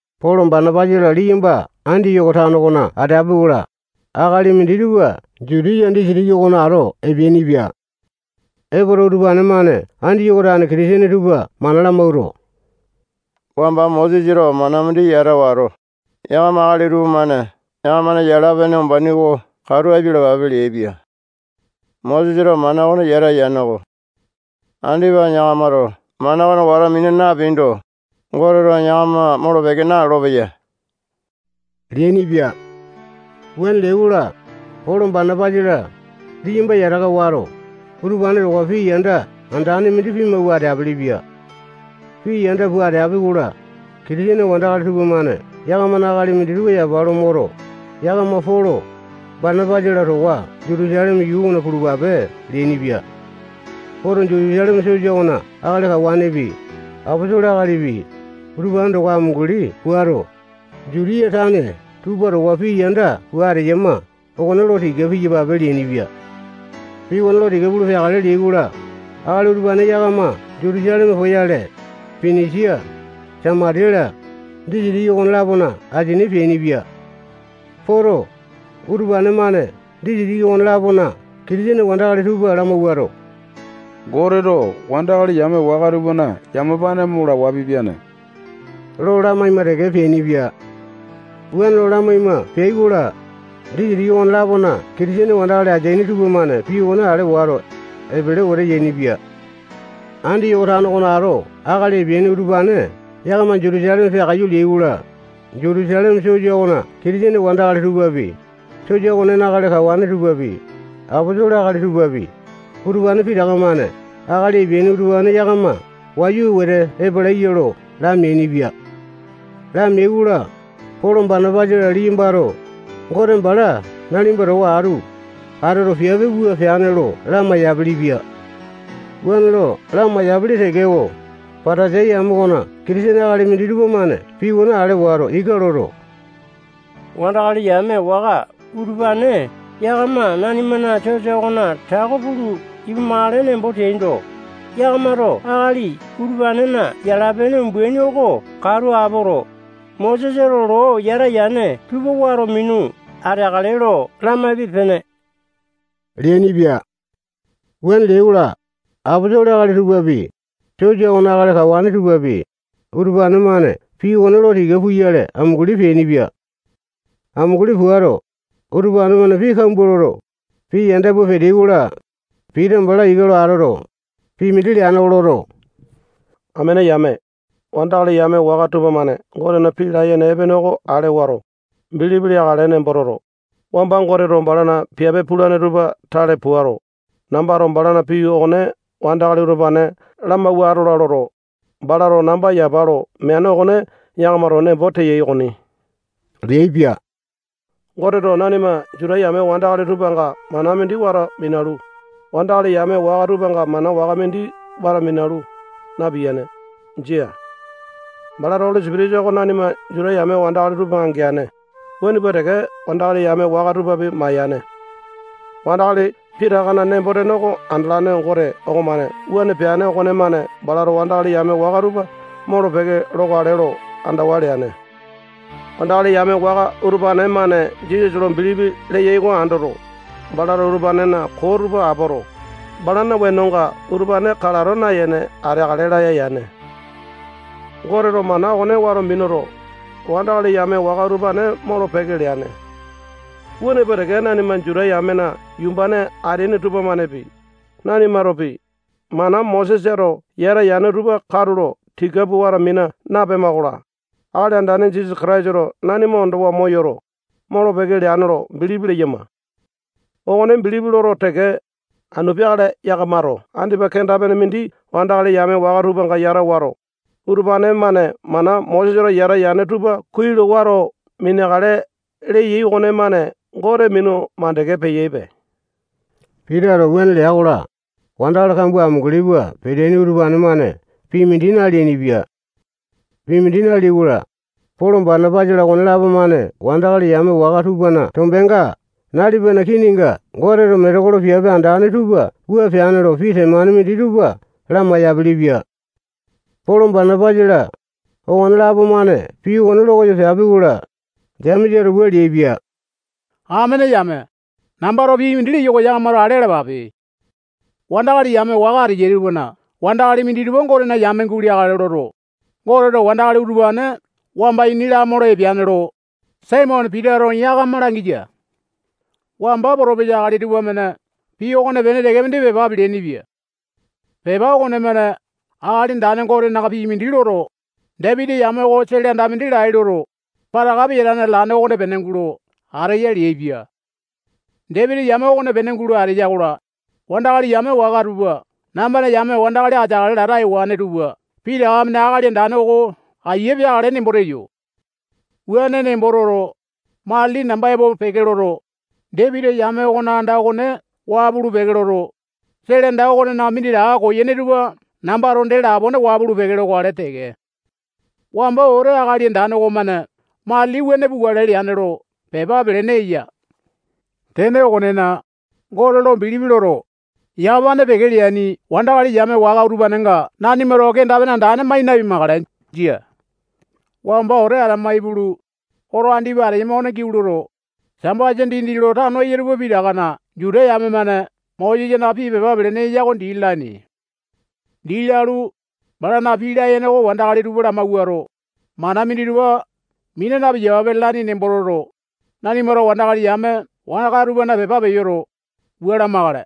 Polo, Banapasa-la, liyamba Andiyoko tano okona ateapi-kola, akali minditupa Jutiya disitiki okona ato epeainipia. Epoto, utupane-mane Andiyoko tane Kitisene tupa mana lamawuato, wamba Mosesato mana mindi yata wato, yakama akali tupamane yakamana yala-pene umbaini oko katu apialapape leaipia. Mosesato mana okone yata yaneko. Andipa yakamato mana okone wato mina napeaindo, Goteto yakama molo-peke nalolo-peya leainipia. Wuane leai-kola, Polo, Banapasa-la, liyamba yataka wato, utupane towa pii yanda andane mindi pimawua ateapele-pia. Pii yanda pua ateapi-kola, Kitisene wandakali tupamane yakamana akali minditupa yapa lo moto, yakama Polo, Banapasa-la towa Jutusaleme yuu okona pulupape leainipia. Poto, Jutusaleme sosa okona akali kawanepi, aposolo akalipi, utupane towa amunguli puato, Jutiya tane tupa towa pii yanda pua ateyama okone lo tika piyapape leainipia. Pii okone lo tika pulu peakale leai-kola, akali utupane yakama Jutusaleme poyale, Pinisia, Samatiya-la, disitiki okolapona asini peainipia. Poto, utupane-mane disitiki okone-lapona Kitisene wandakali tupa lamawuato, Goteto wandakali yame waka tupana yamapane mo lawa pipiane lo lamaima teke peainipia. Wuane lo lamaima peai-kola, disitiki okone-lapona Kitisene wandakali ateaini tupamane pii okone ale wato, epele wete yainipia. Andiyoko tano okona ato akali epeaini utupane yakama Jutusaleme peakaiyu leai-kola, Jutusaleme sosa okona Kitisene wandakali tupapi, sosa okonena akali kawane tupapi, aposolo akali tupapi, utupane pitaka-mane akali epeaini utupane yakama wayu wete epalaiya lo lameainipia. Lameai-kola, Polo, Banapasa-la, liyambato Gote bala nalipa towa atu atoto, piape wua peane lo lamai-yapilipia. Wuane lo lamai-yapili tekeko, Patasai yame okona Kitisene akali minditupa-mane pii okone ale wato, ika loto, wandakali yame waka utupane yakama nanimana sosa okona tako pulu ipumakale nembo teaindo, yakamato akali utupanena yala-pene umbaini oko katu apoto, Mosesato loo yata yane tupa wato minu ateakale lo lamaipe-pene leainipia. Wuane leai-kola, aposolo akali tupapi, sosa okona akali kawane tupapi, utupane-mane pii okone lo tika puyale amunguli peainipia. Amunguli puato, utupane-mane pii kambua loto, pii yanda pua peteai-kola, Pita bala ika lo atoto, pii mindi leane oko loto, amene yame, wandakali yame waka tupamane Gotena pii layene epene oko ale wato, bilipi leakale nembo toto, wamba Goteto balana piape pulane tupa tale puato, nambato balana pii okone wandakali utupane lamawua atola loto, balato namba yapa lo meane okone yakamato nembo teyai okoni leaipia. Goteto nanima Juta yame wandakali tupanga mana mindi wato minalu, wandakali yame waka tupanga mana waka mindi wato minalu, napiyane. Jia. Balato Oli Sipitisa oko nanima Juta yame wandakali tupanga geane, wuane pua teke wandakali yame waka tupapi mayane. Wandakali pitakana nembo-tene oko andalane Gote okomane wuane peane okonemane balato wandakali yame waka tupa molo-peke lokale lo andawa leane. Wandakali yame waka utupane-mane Jisasa lo bilipi leyai oko andoto, balato utupanena koo tupa apoto, balana wenonga utupane kalato nayene ateakale laya yane. Goteto mana okone wato minuto, wandakali yame waka utupane molo-peke leane. Wuane pua teke nanima Juta yamena yumbane ateaini tupamanepi, nanimatopi, mana Mosesato yata yane tupa katulo tika pua wato mina napema-kola, Akali Andane Jisasa Kataisato nanima ondowa moyoto, molo-peke leane lo bilipi leyama. Okone bilipi loto teke, anu peakale yakamato andipa kenda-pene mindi wandakali yame waka tupanga yata wato, utupane-mane mana Mosesato yata yane tupa kuai lo wato mineakale leyai okonemane Gote minu mandeke peyaipe. Pitato wuane lea-kola, wandakali kambua amunguli pua peteaini utupane-mane pii mindi naleainipia. Pii mindi naleai-kola, Polo, Banapasa-la, okonelapo-mane wandakali yame waka tupana tombenga nalipana kininga Goteto metekolo piape andane tupa wua peane lo pii temane minditupa lamai-yapilipia. Polo, Banapasa-la, okonelapo-mane pii okone lokoyo peapi-kola, Jemesato wua leaipia: Amene yame, nambato pii mindi leyo oko yakamato ale alapape. Wandakali yame waka ateyai tupana wandakali minditupa Gotena yame guleakale loto, Goteto wandakali utupane wamba ini lamolo epeane lo, Saimone Pitato yakama langiya. Wamba potopesa akali tupamane pii okonepene teke mindi pepa peleaini-pia. Pepa okonemane Akali Andane Gotena pii mindi loto, Dapiti yame oko sele anda mindi lai loto, pataka peyatane atalane okonepene gulo ateya leaipia. Dapiti yame okonepene gulo ateya-kola, wandakali yame waka tupa nambana yame wandakali ateakale lata ewane tupa pitaka-mane Akali Andane oko aiya peakale nembo teyo. Wuane nembo toto, matili namba epo peke loto, Dapiti yame okona anda okone waa pulu-peke loto, sele anda okonena minditaka koyene tupa nambato dee lapone waa pulu-peke lokale teke. Wamba wete Akali Andane okomane matili wuane pukale leane lo pepa pelene eya. Tene okonena, Gote lo bilipi loto, yamapane peke leaini wandakali yame waka utupanenga nanimato kenda-pene andane mai napimakale. Jia. Wamba wete atama ipulu, oto andipa ateyama okona giau loto, Sambasa dindi lo tano eyai tupa pitakana Juta yame-mane Mosesana pii pepa pelene eya oko dii lalaini. Dii lalu, balana pii layene oko wandakali tupa lamawuato, mana minditupa mina napiyapape lalaini nembo toto, nanimato wandakali yame waka tupana pepa peyoto, wua lamakale: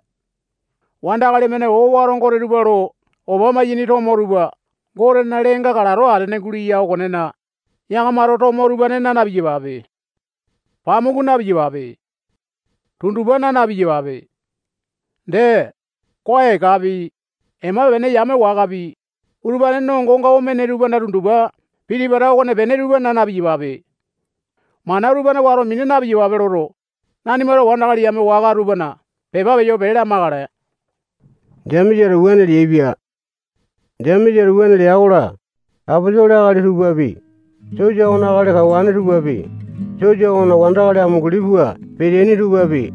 Wandakali-mane owato gote tupa lo opa maiyene tomo tupa Gotena leenga kalato atene guleya okonena, yakamato tomo utupane naa na-piyapape. Pamuku napiyape. Tundupa naa na-piyapape. Dee, koa ekapi, ema-pene yame wakapi, utupane nongonga omene tupana tundupa piti-pata okonepene tupa naa na-piyapape. Mana utupane wato mina na-piyapape loto, nanimato wandakali yame waka tupana pepa peyo pee lamakale. Jemesato wuane leaipia. Jemesato wuane lea-kola, aposolo akali tupapi, sosa okona akali kawane tupapi, sosa okona wandakali amunguli pua peteaini tupapi,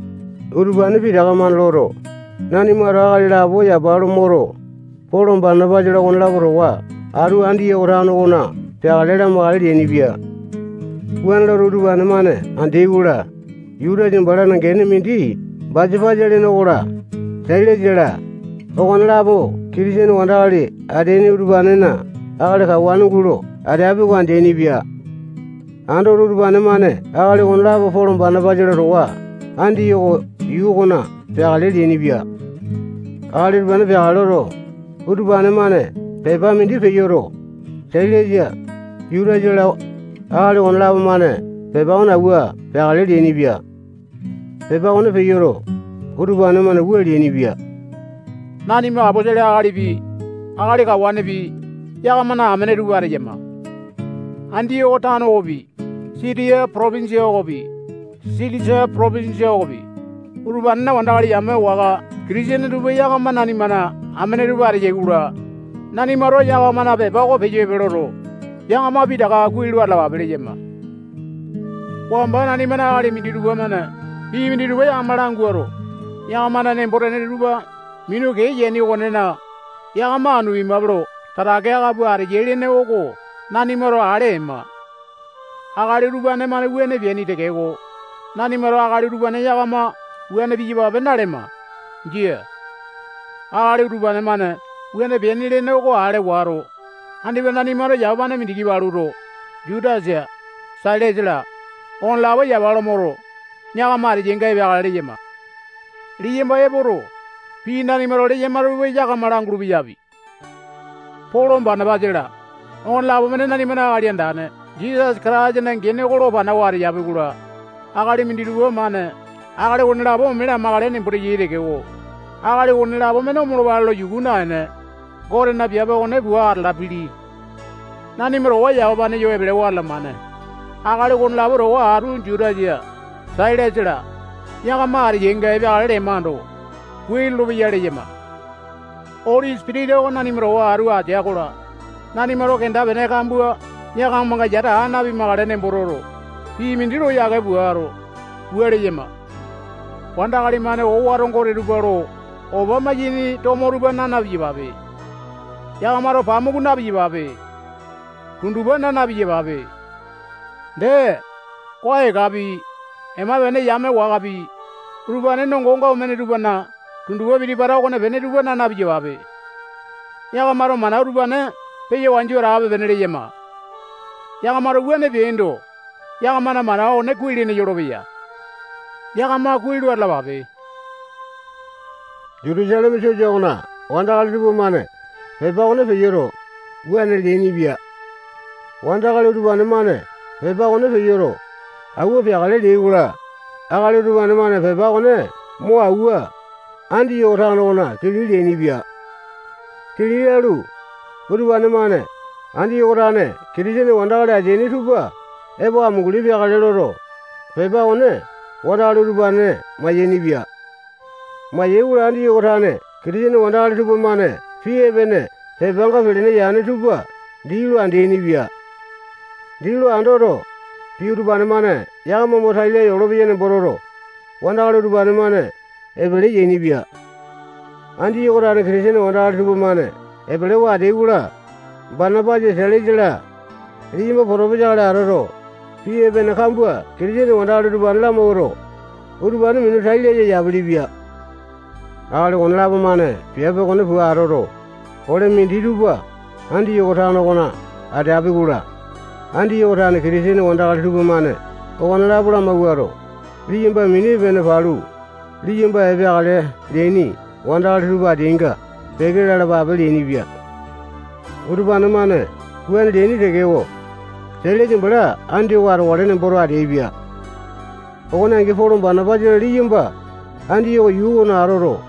utupane pitaka-mane loto, nanimato akali lapo yapa lo moto, Polo, Banapasa-la, okonelapo towa atu Andiyoko tano okona peakale lamakale leainipia. Wuane loto, utupane-mane andeai-kola, Jutasa balana gene mindi Basapasa lene okola, Sailasa-la, okonelapo Kitisene wandakali ateaini utupanena akali kawane gulo ateapi oko andeaini-pia. Andoto, utupane-mane akali okonelapo Polo, Banapasa-la towa Andiyoko yuu okona peakale leainipia. Akali utupane peakale loto, utupane-mane pepa mindi peyoto, Sailasa, Jutasa-la, akali okonelapo-mane pepa okone awua peakale leainipia. Pepa okone peyoto, utupane-mane wua leainipia: Nanima aposolo akalipi, akali kawanepi, yakamana amene tupa ateyama. Andiyoko tano okopi, Sitiya potopinjia okopi, Silisia potopinjia okopi, utupanena wandakali yame waka Kitisene tupa yakama nanimana amene tupa ateyai-kola, nanimato yakamana pepa oko peyo epe loto, yakama pitaka kuai lo atalapape leyama. Wamba nanimana akali minditupa-mane pii minditupa yakama languato, yakamana nembo-tene tupa minu kee yaini okonena, yakama anu pimape lo tatake aka pua ateyai lene oko nanimato ale ema. Akali utupane-mane wuane peaini tekeko, nanimato akali utupane yakama wuane piyapape nalema. Jia. Akali utupane-mane wuane peaini lene oko ale wato, andipa nanimato yamapane mindiki paluto, Jutasa, Sailasa-la, okonelapo yapa lo moto, yakama ateyainga epeakale leyama. Liyamba epoto, pii nanimato leyama tupa yakama langulu-peyapi. Polo, Banapasa-la, okonelapo-mane nanimana Akali Andane Jisasa Kataisana gene oko lo panawa ateyapi-kola, akali minditupa-mane akali okonelapo ome lamakale nembo teyai tekeko, akali okonelapo-mane omolopale lo yuku naene, Gotena piape okone pua atalapili. Nanima towa yamapane yo epelewa atalamane akali okonelapo towa atu Jutasa, Sailasa-la, yakama ateyainga epeakale lemando, kuai lolopeya leyama. Oli Sipitisa oko nanima towa atu atea-kola, nanimato kenda-pene kambua yakamanga yata aa napimakale nembo toto, pii mindi lo yake puato, wua leyama: Wandakali-mane owato gote tupa lo opa maiyene tomo tupa naa na-piyapape. Yakamato pamuku na-piyapape. Tundupa naa na-piyapape. Dee, koa ekapi, ema-pene yame wakapi, utupane nongonga omene tupana tundupa piti-pata okonepene tupa naa na-piyapape. Yakamato mana utupane peya wanju atape-pene leyama. Yakamato wuane peaindo, yakamana mana okone kuai-lene yolopeya. Yakama kuai lo atalapape. Jutusaleme sosa okona wandakali tupamane pepa okone peyoto, wuane leainipia. Wandakali utupane-mane pepa okone peyoto, awua peakale leai-kola, akali utupane-mane pepa okone mo awua, Andiyoko tano okona kili leainipia. Kili lalu, utupane-mane Andiyoko tane Kitisene wandakali ateaini tupa epo amunguli peakale loto, pepa okone wandakali utupane mayainipia. Mayai-kola, Andiyoko tane Kitisene wandakali tupamane pii epene pepanga pelene yane tupa dii lo andeaini-pia. Dii lo andoto, pii utupane-mane yakama mo tai laya olopeya nembo toto, wandakali utupane-mane epele yainipia. Andiyoko tane Kitisene wandakali tupamane epelewa ateai-kola, Banapasa, Sailasa-la, liyamba potopesa akali atoto, pii epene kambua Kitisene wandakali utupane lamawuato, utupane minu tai laya yapilipia. Akali okonelapo-mane piape okone pua atoto, ole minditupa Andiyoko tano okona ateapi-kola, Andiyoko tane Kitisene wandakali tupamane okonelapo lamawuato, liyamba mini epene palu, liyamba epeakale leaini wandakali tupa ateainga peke lalapape leainipia. [Utupane-mane wuane leaini tekeko, Sailasa bala Andiyoko atokale nemboto ateaipia.] Okone angi, Polo, Banapasa-la, liyamba Andiyoko yuu okona atoto,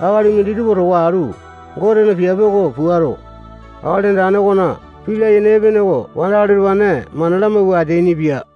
akali minditupa towa atu Gotena piape oko puato, Akali Andane okona pii layene epene oko wandakali utupane mana lamawua ateainipia.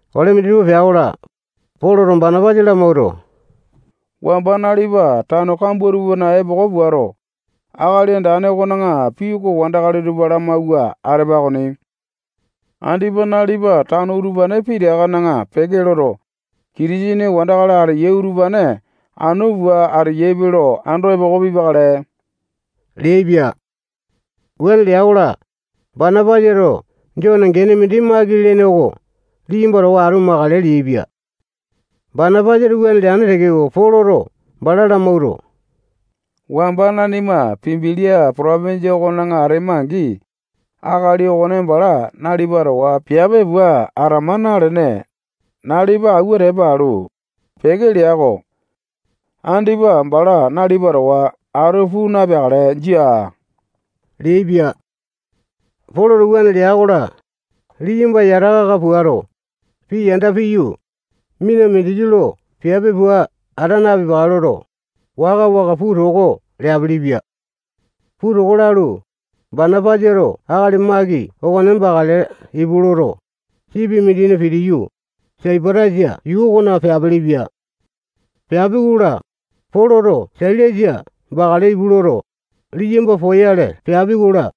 Ole minditupa pea-kola, Poloto Banapasa lamawuato, wamba nalipa tano kambua tupana epoko puato, Akali Andane okona pii oko wandakali tupa lamawua atepa okoni. Andipa nalipa tano utupane pitakana peke loto, Kitisene wandakali ateyai utupane anu pua ateyaipe lo ando epoko pipakale leaipia. Wuane lea-kola, Banapasato Jone gene mindi Maki lene oko liyamba towa atu makale leaipia. Banapasato wuane leane tekeko, Poloto bala lamawuato, wamba nanima Pambilia potopinjia okona atema-angi, akali okone bala nalipa towa piape pua atama nalene, nalipa awua tepa alu, peke lea-ko. Andipa bala nalipa towa atu puu napeakale, jia leaipia. Poloto wuane lea-kola, liyamba yataka aka puato, pii yanda piyu, mina mindiki lo piape pua ata napipakale loto, waka-waka puu toko leapilipia. Pua toko lalu, Banapasato akali Maki okone bakale ipu loto, sipi mindina pitiyu, Saipatasa yuu okona peapilipia. Peapi-kola, Poloto Sailasa bakale ipu loto, liyamba poyale peapi-kola,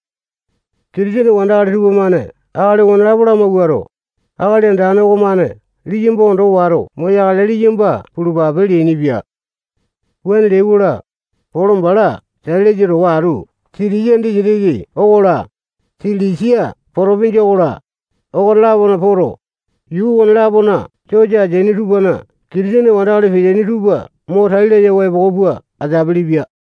Kitisene wandakali tupamane akali okonelapo lamawuato, Akali Andane okomane liyamba ondo wato moyakale. Liyamba pulupape leainipia. Wuane leai-kola, Polo bala Sailasa towa atu Sitiya disitiki okola, Silisia potopinjia okola, okone-lapona poto, yuu okone-lapona sosa ateaini tupana Kitisene wandakali peteaini tupa mo tai layawa epoko pua ateapili-pia.